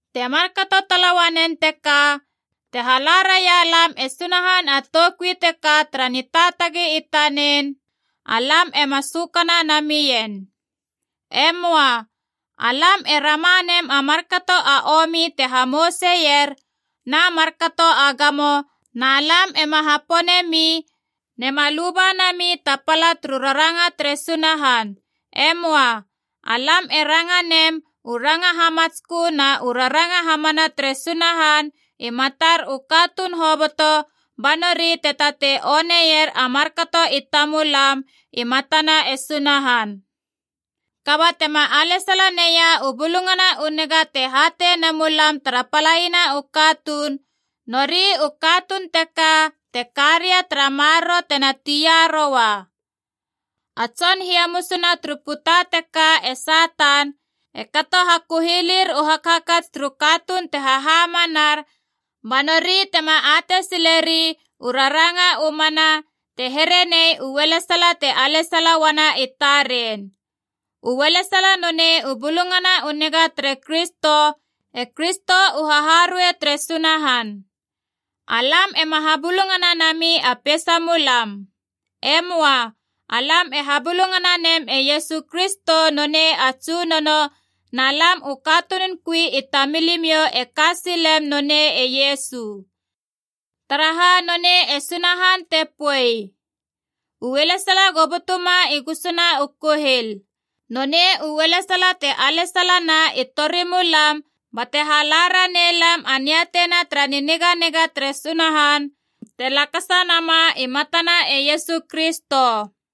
Te markato tala uanen teka, te hala raialam e Sunahan a toukui teka tara nitaatagi i tanen, alam ema sökana namien. E möa. Alam e rama nem a markato a omi te hamouseier, na markato a gamo, na lam ema hapone mi, nema luba nami ta pala turu raranga tere Sunahan. E möa. Alam e ranga nem u ranga hamatskö na u raranga hamana tere Sunahan i matar u katuun hoboto ba nori te tatei oneier a markato i tamulam i matana e Sunahan. Kaba tema alesala neia u Bulungana u Niga te hatei ne mulam tara palaiana u katuun, nori u katuun teka te karia tara maroro tena tia roua. A tson hiamus na turu puta teka e Satan, e kato hakuhilir u hakhakats turu katuun te hahamanar banori tema atei sileri u raranga u mana, te here nei u ualesala te alesala uana i taren. U ualesala nonei u Bulungana u Niga tere Kristo, e Kristo u haharuei tere Sunahan. Alam ema habulungana nami a peisamulam. E möa. Alam e habulungana nem e Iesu Kristo nonei a Tsunono, na lam u katunun kui i tamilimiou e ka silem nonei e Iesu. Taraha nonei e Sunahan te poei, U alesala go butuma i gusuna u kuhil. Nonei u ualesala te alesalana i torimulam bate hala ranei lam a niatei na tara niniganiga tere Sunahan te lakasa nama i matana e Iesu Kristo.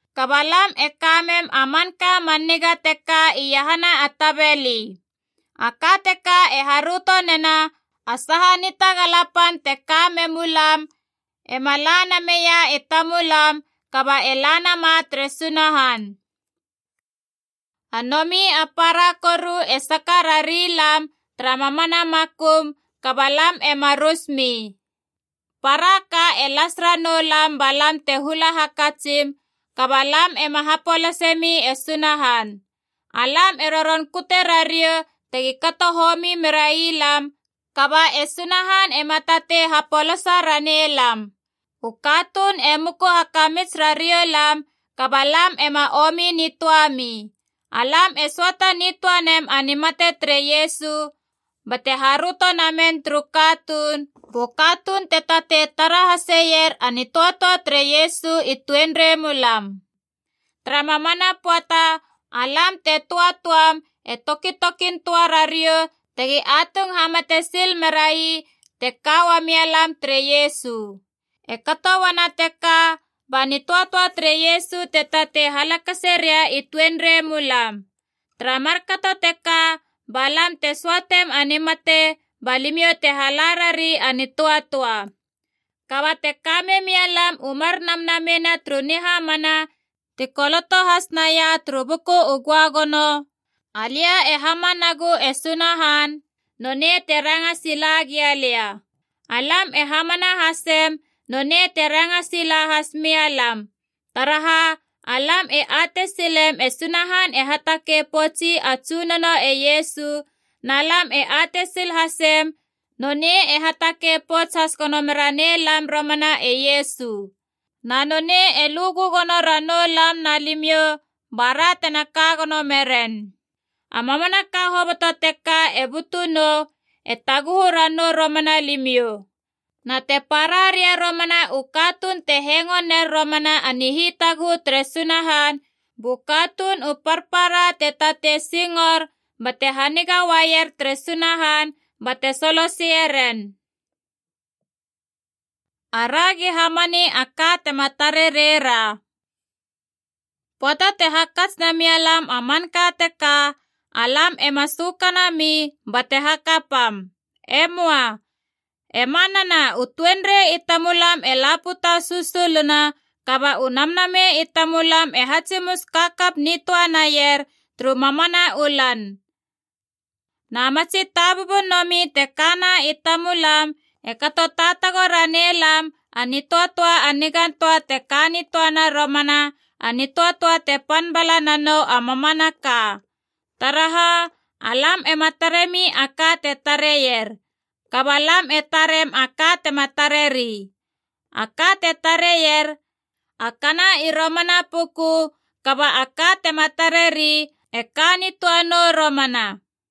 Kaba lam e kamem a manka a man niga teka iahana a tabeli. A ka teka e haröto nena a saha nitagala pan te ka memu lam ema la nameia i tamulam kaba e la nama tere Sunahan. A nomi a para koru e saka rari lam tara mamana makum, kaba lam ema rusmi. Para ka e las ranou lam ba lam te hula hakatsim, kaba lam ema hapolase mi e Sunahan. Alam e roron kute rariou tegi kato homi merai lam, kaba e Sunahan ema tatei hapolasa ranei lam. U katuun e muku hakamits rariou lam, kaba lam ema omi nitöami. Alam e söata nitöa nem a nimate tere Iesu bate haröto namen turu katuun, bu katuun te tatei tara haseier a nitöatöa tere Iesu i tuenrei mulam. Tara mamana pöata, alam te töatöam e tokitokin töa rariou tegi atung hamate sil merai te ka uamia lam tere Iesu. E kato uana teka ba nitöatöa tere Iesu te tatei halakase ria i tuenrei mulam. Tara markato teka ba lam te söatem a nimate ba limiou te hala rari a nitöatöa. Kaba te kamemia lam u mar namnamei na turu nihamana ti koloto has naia turu Buku u Göagono, “Alia e hamanagu e Sunahan, nonei te ranga sila gia lia.” Alam e hamana hasem, nonei te ranga sila has mia lam. Taraha, alam e atei silem e Sunahan e hatakei poutsi a Tsunono e Iesu, na lam e atei sil hasem nonei e hatakei pouts has gono meranei lam romana e Iesu. Na nonei e lu gögono ranou lam na limiou bara tena ka gono meren. A mamanaka hoboto teka te butunou, e taguhu ranou romana limiou. Na te para ria romana u katuun te hengo ner romana a nihitaguhu tere Sunahan, bu katuun u parpara te tatei singor bate haniga uaier tere Sunahan bate soloseie ren. Aragi hamani a ka tema tare reira. Pöata te hakats na mia lam a manka teka, alam ema sökanami bate hakapam. E möa. E manana, u tuenrei i tamulam e la puta susuluna, kaba u namnamei i tamulam e hatsimus kakap nitöa naier turu mamana u lan. Na matsi tabubun nomi te kana i tamulam e kato taatago ranei lam a nitöatöa a nigan töa te ka nitöana romana, a nitöatöa te pan bala nanou a mamanaka. Taraha, alam ema taremi a ka te tareier, kaba lam e tarem a ka tema tareri. A ka te tareier, a kana i romana puku, kaba a ka tema tareri, e ka nitöa nou romana.